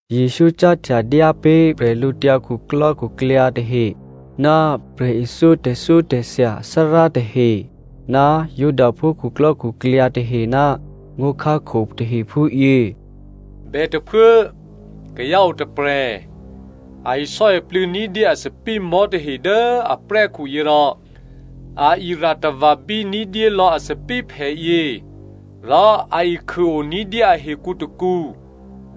Jesǔ cáhtya dyá pé̤ bwídukhu tahe ná prè̤ithyó tè̤thyótè̤thya athárá tahe ná Judaphú khuklò́khuklyǎ tahe ná ngó̤khákho tahe phúyě, “Bètôphuố, kayǎ o tôprè̤, a isò́iplû̌ ní̤dyé a thòbǐthèmò̤́ tahe dố aprè́khu yě rò a ira̤tava̤bí ní̤dyé lò̌ a thòbǐthèphè yě, rò a ikhûo ní̤dyé ahekǔ tôkǔ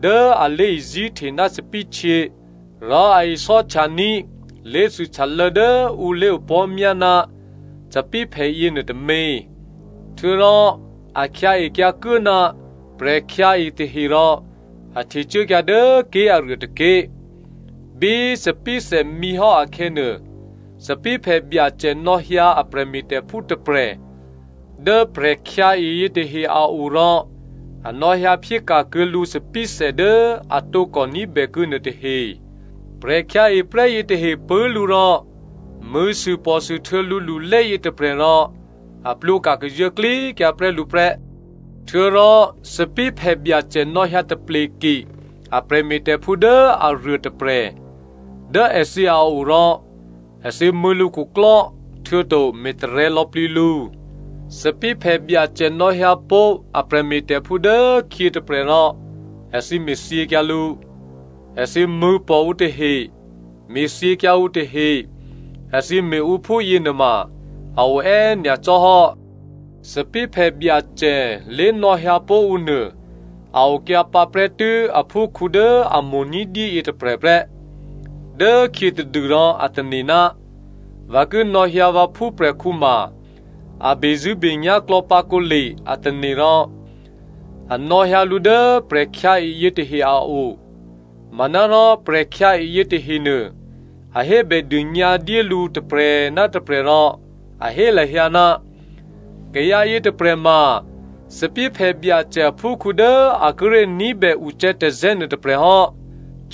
dố a lé̤izí̤hte ná thòbǐthèhtyě, rò a isò́htyaní̤ lé̤thûhtyalô̌ dố ǔ lé̤opò̤́myá ná thòbǐthèphè yěnuô tômě. Htuô̌rò a khyǎekyǎ kuố ná prè̤khyǎe tahe rò a htecuốkyǎ dố ké̤aruô tôké̤. Bí thòbǐthè mǐhò́ akhè̌nuô, thòbǐthèphè byacè nò̌hyǎ a prè̤me̤tè̤phú tôprè̤ dố prè̤khyǎe yětahe a o rò a nò̌hyǎ phyéka̤kuô̌ lǔ thòbǐthè dố a tǒkò ní̤bèkuô̌ nuôtahe. Prè̤khyǎeprè́ yětahe pṳ̂́ lǔ rò mṳ̂̌sûpò̤sûhtuô̌ lǔlulé yětôprè̤ rò a plwǒka̤ kazuô̌klíkyǎ prè́ lǔ prè́. Htuô̌rò thòbǐthèphè byacè nò̌hyǎ tapleke a prè̤me̤tè̤phú dố aruô tôprè̤ dố èthǐ a o rò èthǐ mṳ̂̌ lǔkhuklò́ htuô̌to me̤tarè̤̌ lò̌plǐ lǔ. Thòbǐthèphè byacè nò̌hyǎ pó̤ a prè̤me̤tè̤phú dố khyě tôprè̤ rò èthǐ me̤thyěkyǎ lǔ. Èthǐ mṳ̂̌pò̤ ǔ tahe me̤thyěkyǎ ǔ tahe. Èthǐ me̤ ǔ phúyě nuôma a o è́ nyacò́ hò́. “Thòbǐthèphè byacè lé̤nò̌hyǎpó̤ ǔ nuô a okyǎ pǎprè́tû́ aphúkhǔ dố a mo̤ ní̤dyé yětôprè̤ prè́. Dốkhyětadû rò a tane̤, ‘Vǎ ki nò̌hyǎ vǎ phúprè̤khǔ ma a bezṳ̂́benyá̤ klò̌pǎ kǒle,’ a tane̤ rò a nò̌hyǎ lǔ dố prè̤khyǎe yětahe a o. “Manárò prè̤khyǎe yětahenuô a hébèdônyǎ dyé lǔ tôprè̤ ná tôprè̤ rò a hé lahyǎ, ‘Kayǎ yětôprè̤ ma thòbǐthèphè byacè aphúkhǔ dố a kíré̤ ní̤bè ucè̌tazè̌ nuôtôprè̤ hò́.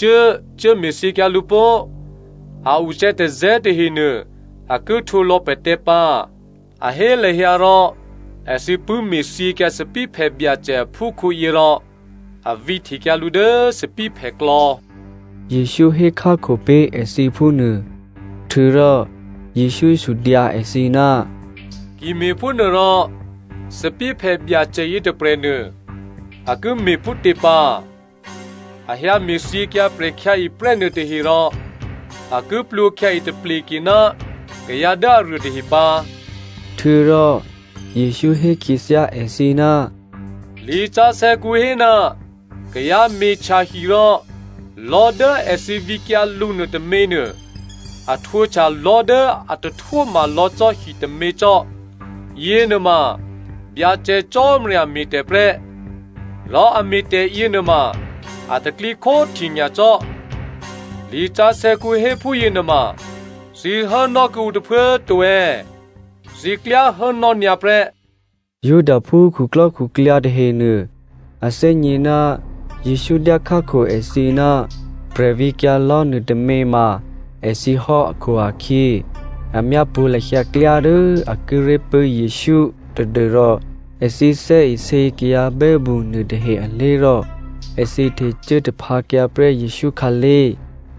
Cuố! Cuốme̤thyěkyǎ lǔ pó꤮! A ucè̌tazè̌ tahenuô a ki htwǒlò̌ pè̤tè̤ pǎ.’ A hé lahyǎ rò èthǐ pṳ̂́ me̤thyěkyǎ thòbǐthèphè byacè aphúkhǔyě rò a vǐhtekyǎ lǔ dố thòbǐthèphèklò̌,” Jesǔ hékhákho pé̤ èthǐ phúnuô. Htuô̌rò Jesǔ sudyǎ èthǐ, “Ki me̤phúnuôrò thòbǐthèphè byacè yětôprè̤nuô a ki me̤ phútě pǎ? A hyǎ me̤thyěkyǎ prè̤khyǎeprè́ nuôtahe rò a ki plwǒkhyǎe tapleke ná kayǎ dố aruô tahe pǎ.” Htuô̌rò Jesǔ hé khyěthyá èthǐ, “Lisǎsè̌kǔ hé, ‘Kayǎ me̤htya hi rò lò̤́ dố èthǐ vǐkyǎ lǔ nuôtôměnuô a htwǒhtya lò̤́ dố a tahtwóma lò̌ cò́ hitômě cò́. Yěnuôma Byacè Cò́marya me̤tè̤ prè́, rò a me̤tè̤ yěnuôma a tè̤pro̤tè̤prya̤ nyacò́.’ “Lisǎsè̌kǔ hé phúyěnuôma thǐ hốnò́ kuô̌ǔ tôphuố꤮ to è̌? Thǐ klyá hốnò́ nyǎ prè́.” Judaphú khuklò́khuklyǎ tahenuô, a thè́gně ná Jesǔ dyá khákho èthǐ ná prè̤vǐkyǎ lò̤́ nuôtômě ma èthǐ hò́ akhu-akhyě a myápṳ̌ lahyǎ klyá dố a kíré̤ pṳ̂́ Jesǔ tadû́rò èthǐ thè́isě kayǎ bè́mṳ nuôtahe alé̤ rò èthǐ htecuố taphǎkyǎ prè́ Jesǔ khǎlé̤.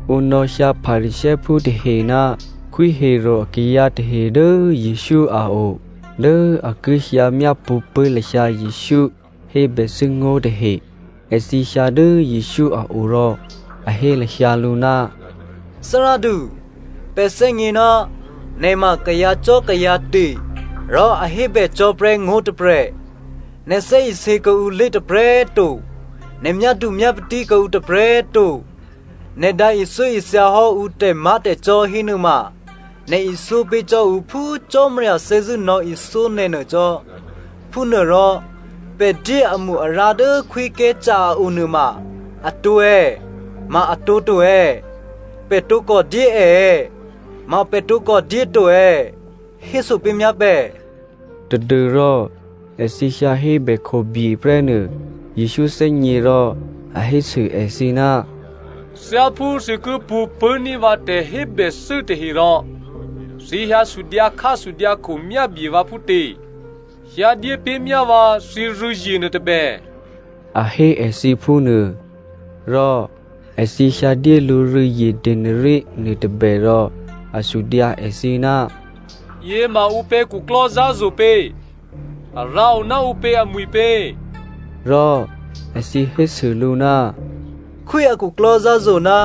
Ǔ nò̌hyǎ Pharisěophú tahe ná Khwí Herodè akayǎ tahe dố Jesǔ a o dố a ki hyǎ myápṳ̌ pṳ̂́ lahyǎ Jesǔ hébèthû́ngó̤ tahe. Èthǐ hyǎ dố Jesǔ a o rò a hé lahyǎ lǔ, “Thárádu꤮ pè̤ thè́gně ná nè̤ ma kayǎcò́kayǎte̤ rò a hébècò́prè́ ngó̤ tôprè̤. Nè̤ thè́isě kuô̌ǔlé̤ tôprè̤꤮ to, nè̤ myádumyápatí kuô̌ǔ tôprè̤꤮ to. Nè̤ dǎ ithyóithyahò́ ǔ tè̤má̤tè̤cò́ hénuôma, nè̤ ithyó pé̤ cò́ ǔ phú Cò́marya thè́zṳ̂́ nò̌ithyó nè̤ nuô cò́. Phúnuôrò pè̤ dyé amo-arǎ dố Khwí Caesare a o nuôma atǒ è̌? Ma atǒ to è̌? Pè̤ tǒkò dyé è è̌? Ma pè̤ tǒkò dyé to è̌? Héso pé̤myá pè̤.” Tadû́rò èthǐ hyǎ hébè khobye prè́ nuô Jesǔ thè́gně rò a hésû èthǐ, “Thyáphú thǐ ki pṳ̌ pṳ̂́ní̤ vǎ tè̤hébèthû́ tahe rò thǐ hyǎ sudyǎkhásudyǎkho myábye vǎ phútě? Hyǎdyé pé̤ myá vǎ thǐrû̌zye nuôtôbè,” a hé èthǐ phúnuô. Rò èthǐ hyǎdyé lǔ rû̌zye denari nuôtôbè rò a sudyǎ èthǐ, “Yěma ǔpě khuklò́zǎ̤zo̤ pě? A rǎo ná ǔpě amwi̤pě?” Rò èthǐ hésû lǔ, “Khwí a khuklò́zǎ̤zo̤ ná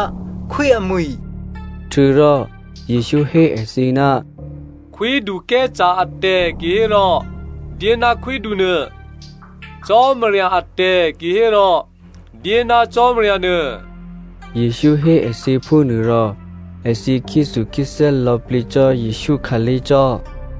khwí amwi̤.” Htuô̌rò Jesǔ hé èthǐ, “Khwídu Caesare atè̤ kihérò dyé ná khwídunuô, Cò́marya atè̤ kihérò dyé ná Cò́marya nuô.” Jesǔ hé èthǐ phúnuô rò èthǐ khyéthukhyéthè́ lò̌plǐ cò́ Jesǔ khǎlé̤ cò́.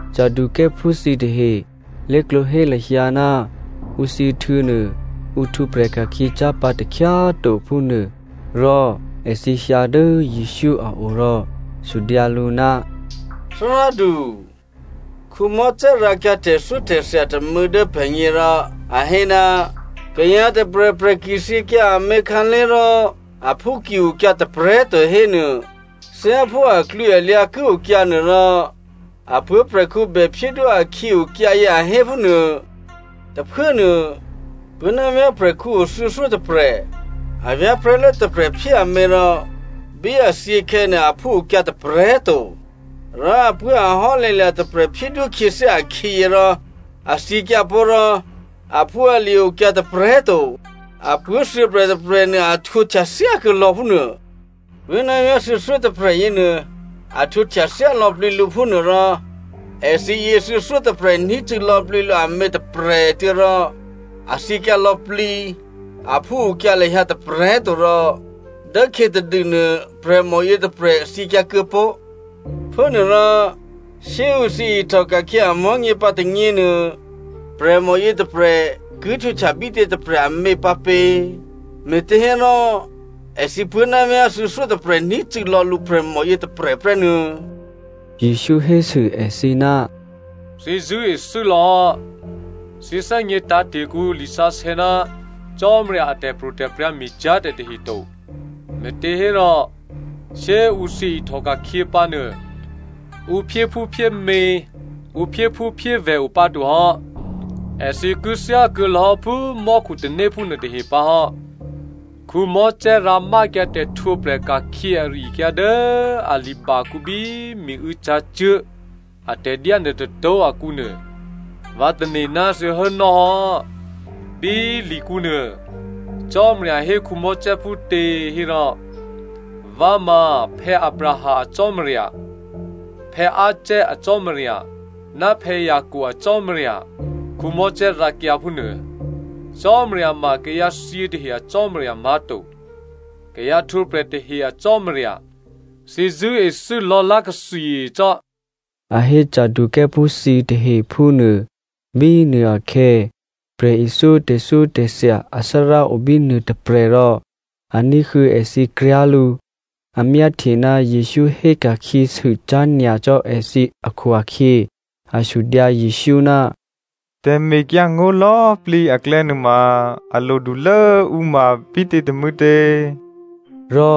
Saducěophú thǐtahe lé̤klǒ hé lahyǎ ná ǔ thyěhtuô̌ nuô ǔ htwǒprè̤ ka̤khyě cyá̤ pǎ takhyá꤮ to phúnuô. Rò èthǐ hyǎ dố Jesǔ a o rò sudyǎ lǔ, “Thárádu꤮, Mosè rǎkyǎ tè̤thyótè̤thya tômû̌ dố pè̤gně rò a hé, kayǎ tôprè̤prè̤ ki thyěkyǎ amě khǎlé̤, rò aphú ki okyǎ tôprè̤꤮ to hénuô, thyáphú aklwǐalyǎ ki okyǎ nuôrò, a puố̤prè̤khǔ bè phyédwó akhǐ okyǎyě, a hé phúnuô. Tôphuốnuô puố̤ ná vyá̤ prè̤khǔ o thuô̌thyótôprè̤. A vyá̤prè̤́lố tôprè̤ phyé amě rò bí a thyěkhè̌nuô aphú okyǎ tôprè̤꤮ to. Rò apuố̤ ahò́lè̤̌lya̤ tôprè̤ phyédwó khyěthyá akhǐyě rò a thyěkyǎpó̤ rò aphúalye̤ okyǎ tôprè̤꤮ to. Apuố̤ thuô̌prè̤tôprè̤ nuô a htwǒhtya thyá kuô̌lò̌ phúnuô. Puố̤návyá̤ thuô̌thyótôprè̤ yěnuô, a htwǒhtya thyá lò̌plǐ lǔ phúnuô, rò èthǐ yě thuô̌thyótôprè̤ ní̤cû̌ lò̌plǐ lǔ amě tôprè̤꤮ tuô̌ rò a thyěkyǎ lò̌plǐ, aphúokyǎ lahyǎ tôprè̤꤮ to rò dốkhyětadûnuô prè̤mò yětôprè̤ thyěkyǎ kuô̌ pó̤. Phúnuôrò shyé꤮ ǔ thyěihtòka̤khyě amò̤́nyě pǎ tônyěnuô, prè̤mò yětôprè̤ ki htwǒ bítě tôprè̤ amě pǎpě? Me̤těhérò èthǐ puố̤návyá̤ thuô̌thyótôprè̤ ní̤cû̌lò̌ lǔ prè̤mò yětôprè̤ prè́ nuô̌꤮.” Jesǔ hésû èthǐ, “Thǐ zṳ̂́ethû́ lò̌hò́, thǐ thè́gně tǎ̤te̤ kuô̌ǔ lisǎsè̌ ná Cò́marya a tè̤pro̤tè̤prya̤ me̤cyá̤ tè̤ tahe to. Me̤těhérò shyé꤮ ǔ thyě ihtòka̤khyě pǎnuô ǔ phyéphúphyémě, ǔ phyéphúphyévè̤ o pǎtohò́, èthǐ ki thyákuô̌lò̌ phú mò́khutanéphú nuôtahe pǎhò́. Mosè rǎmákyǎ tè̤htwǒprè̤ ka̤khyě ari-akyǎ dố a libakǔ bí miû̌ cǎcuố̤ atè̤dyá nuôtôtó̤ akǔnuô, vǎ tane̤ ná thǐ hốnò́ hò́. Bí likǔnuô, Cò́marya hé Mosè phútě hérò, ‘Vǎ ma Abraham a Cò́marya, Isaac a Cò́marya, ná Jacob a Cò́marya,’ Mosè rǎkyǎ phúnuô. Cò́marya ma kayǎthyě tahe a Cò́marya má̤to, kayǎ htwǒprè̤ tahe a Cò́marya. Thǐ zṳ̂́ethû́ lò̌lá̤takli cò́,” a hé Saducěophú thǐtahe phúnuô. Bínuôakhè̌ prè̤ithyó tè̤thyótè̤thya athárá obínuô tôprè̤ rò a ní̤huô̌ èthǐ kryá̤ lǔ. A myáhtye ná Jesǔ hé ka̤khyěsû cyá̤ nyacò́ èthǐ akhu-akhyě a sudyǎ Jesǔ, “Tè̤mekyǎngó̤ lò̌꤮ plǐ aklè̌ nuôma a lodulố ǔ ma bítě tômû̌tě?” Rò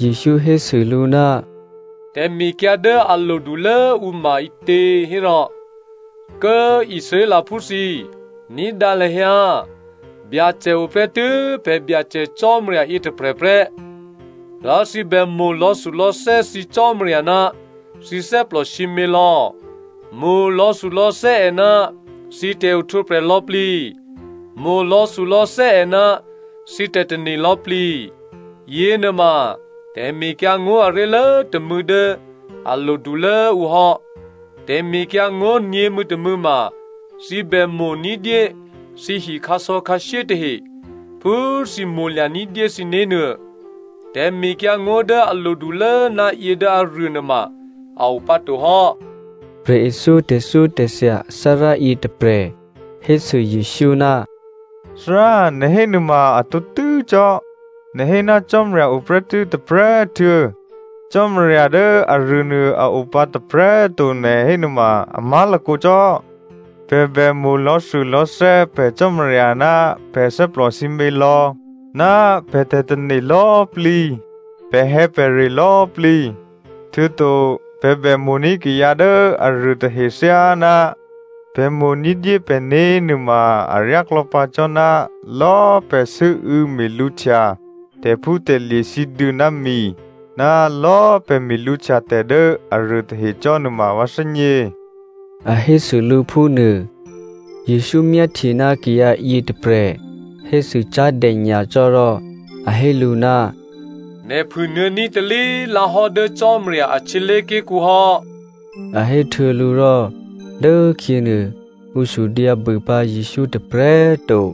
Jesǔ hésû lǔ, “Tè̤mekyǎ dố a lodulố ǔ ma ǐtě hérò, ‘Kố꤮ Israelphú thǐ꤮, ní̤dǎ lahyǎ꤮ Byacè o prè́tû́ pè̤ Byacè Cò́marya yětôprè̤ prè́. Rò thǐ bè mo̤ lò̌thulò̌thè́ thǐ Cò́marya ná thǐ thè́plò sǐmělò̌, mo̤ lò̌thulò̌thè́ è ná thǐ tè̤ohtwǒprè̤ lò̌꤮ plǐ, mo̤ lò̌thulò̌thè́ è ná thǐ tè̤tane̤ lò̌꤮ plǐ,’ yěnuôma tè̤mekyǎngó̤ aré̤lố tômû̌ dố a lodulố ǔ hò́. Tè̤mekyǎngó̤ nyě̤mû̌tômû̌ ma, ‘Thǐ bè mo̤ ní̤dyé thǐhi khǎsò̌khǎshyé tahe phú thǐ mo̤lya̤ ní̤dyé thǐné̤ nuô.’ Tè̤mekyǎngó̤ dố a lodulố ná yě dố aruô nuôma a o pǎto hò́.” Prè̤ithyó tè̤thyótè̤thya athárá yětôprè̤ hésû Jesǔ, “Thárá꤮ nè̤ hé nuôma a tǒtû́ cò́, nè̤ hé ná Cò́marya o prè́tû́ tôprè̤꤮ tuô̌, Cò́marya dố aruônuô a o pǎ tôprè̤꤮ to nè̤ hé nuôma a má̤lakǒ cò́. Pè̤ bè mo̤ lò̌thulò̌thè́ pè̤ Cò́marya ná pè̤ thè́plò sǐmělò̌, ná pè̤ tè̤tane̤ lò̌꤮ plǐ, pè̤hè̌pè̤re lò̌꤮ plǐ. Htuô̌to pè̤ bè mo̤ní̤ kayǎ dố aruôtahe thyáná pè̤ mo̤ ní̤dyé pè̤né̤ nuôma aryáklò̌ pǎ cò́ ná lò̌꤮ pè̤ sû́û̌ me̤lǔhtya tè̤phútè̤lye̤ sǐduô̌ ná mi ná lò̌꤮ pè̤ me̤lǔhtya tè̤ dố aruô tahe cò́ nuôma vǎ thè́gně,” a hésû lǔ phúnuô. Jesǔ myáhtye ná kayǎ yětôprè̤ hésû cyá̤dè nyacò́ rò a hé lǔ, “Nè̤ phû nuô̌ní̤ talí꤮ lǎ hò́ dố Cò́marya a htyělé̤ké̤kǔ hò́,” a héhtuô̌ lǔ rò dốkhyěnuô ǔ sudyǎbû pǎ Jesǔ tôprè̤꤮ to.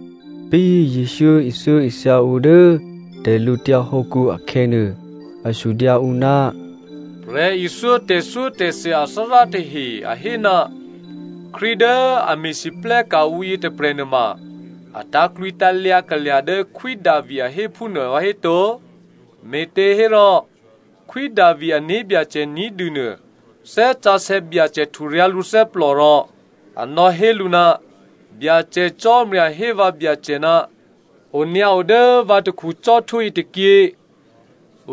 Bí Jesǔ ithyóithya ǔ dố tè̤lǔtyǎ hǒkǔ akhè̌nuô, a sudyǎ ǔ, “Prè̤ithyó tè̤thyótè̤thya athárá tahe a hé ná Krístu dố a me̤lwóhteka̤ ǔ yětôprè̤ nuôma a tǎ̤klwǐtǎ̤lyǎ kalya̤ dố Khwí Davi a hé phúnuô vǎhéto? Me̤těhérò Khwí Davi ané̤byacè ní̤dû nuô Thè́ Sǎsè̌ Byacè hturyǎ̤ lǔthè́plò rò a nò̌hé lǔ, ‘Byacè Cò́marya hé vǎ Byacè, “Onyǎo dố vǎ takhu cò́htwó yětôkyě,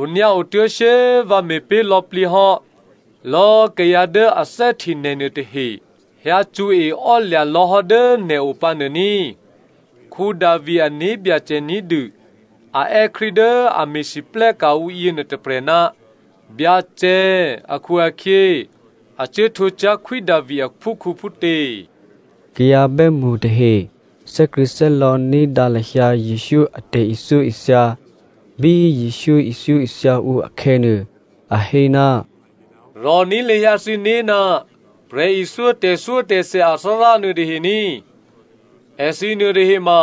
onyǎo tuố̤ shyé꤮ vǎ me̤pé̤ lò̌plǐ hò́ lò̌꤮ kayǎ dố a thè́hte nè̤ nuôtahe hyǎcṳ̌e ò́lya̤ lò̌hò́ dố nè̤ o pǎ nuô ní꤮.”’ “Davi ané̤byacè ní̤dû a è́ Krístu dố a me̤lwóhteka̤ ǔ yěnuô tôprè̤, ‘Byacè’ akhu-akhyě a cuố htwǒ cyá̤ Khwí Davi aphúkhǔ phútě?” Kayǎ bè́mṳ tahe thè́krṳ̂̌thè́lò̌ ní̤dǎ lahyǎ Jesǔ a tè̤ithyóithya. Bí Jesǔ ithyóithya ǔ akhè̌nuô, a hé, “Rò̤ní̤ lahyǎ thǐné̤ ná prè̤ithyó tè̤thyótè̤thya athárá nuôtahe ní꤮. Èthǐ nuôtahe ma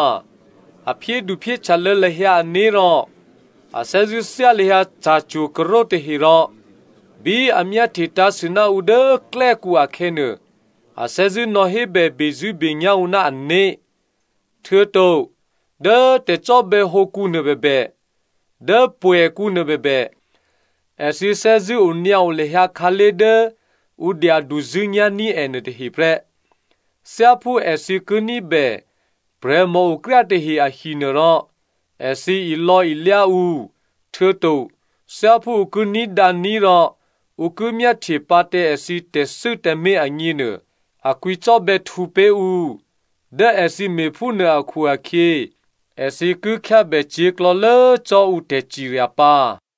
a phyéduphyéhtyalô̌ lahyǎ ané̤ rò a thè́zṳ̂́ thyá lahyǎ ca̤cwo̤karo̤ tahe rò bí a myáhtye tǎ̤sû ná ǔ dố klè́kǔ akhè̌nuô, a thè́zṳ̂́ nò̌hébè bezṳ̂́benyá̤ ǔ ná ané̤. Htuô̌to dố tè̤cò́bè̌hǒkǔ nuôbèbè, dố pwè̌kǔ nuôbèbè, èthǐ thè́zṳ̂́ onyǎo lahyǎ khǎlé̤ dố ǔ dyaduzṳ̂́nyá̤ní̤ è nuôtahe prè́. Thyáphú èthǐ ki ní̤bè prè̤mòokryá tahe ahinuôrò, èthǐ ilò̌ilyá ǔ, htuô̌to thyáphú ǔ ki ní̤dǎní̤ rò ǔ ki myáhtye pǎ tǎ èthǐ tè̤thû́ tǎmé̤ agněnuô, a kwǐcò́bè̌htǔ pé̤ ǔ. Dố èthǐ me̤phúnuô akhu-akhyě èthǐ ki khyábè cyě̤klò̌lố cò́ ǔ tè̤cirya pǎ.”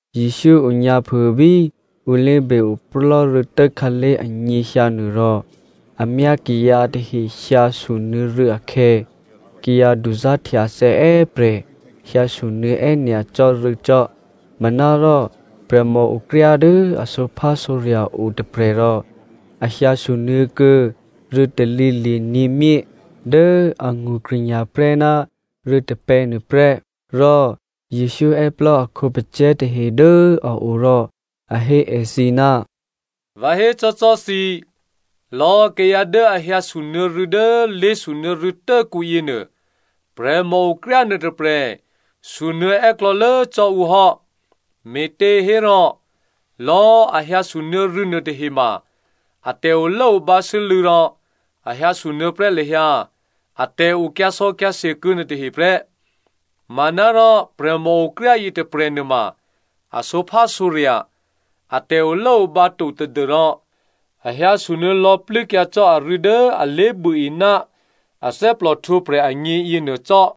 Jesǔ onyǎphû bí ǔ lé̤be-oplò́ rû̌tố khǎlé̤ anyěhyǎ nuô rò a myá kayǎ tahe hyǎ sunuô̌ rû̌ akhè̌, kayǎ duzá̤htyathè̌ è́prè̤ hyǎ sunuô̌ è́nyacò́ rû̌ cò́. Manárò prè̤mòokryá dố a sǒphásǒrya̤ o tôprè̤ rò a hyǎ sunuô̌ kuô̌ rû̌ talǐli̤ nyě̤myé dố angṳ krṳ̂nya̤ prè́ ná rû̌ tôpè̌ nuôprè́. Rò Jesǔ è́plò́ a khǒpacè̤̌ tahe dố a o rò a hé èthǐ, “Vǎ hécò́cò́꤮ thǐ, lò̌꤮ kayǎ dố a hyǎsunuô̌ rû̌ dố lé̤sunuô̌ rû̌tốkǔ yěnuô prè̤mòokryá nuôtôprè̤ sunuô̌ è́klò̌lố cò́ ǔ hò́. Me̤těhérò lò̌꤮ a hyǎsunuô̌ rû̌ nuôtahema, a tè̤olốobǎ sû́lû̌ rò a hyǎsunuô̌ prè́ lahyǎ atè̤ o kyǎsò̌kyǎse kyǎ nuôtahe prè́. Manárò prè̤mòokryá yětôprè̤ nuôma a sǒphásǒrya̤, a tè̤olốobǎ to tadû́rò a hyǎsunuô̌ lò̌plû́kyǎ cò́ arû̌ dố a lé̤buôe ná a thè́plòhtwǒprè̤ agně yěnuô cò́.”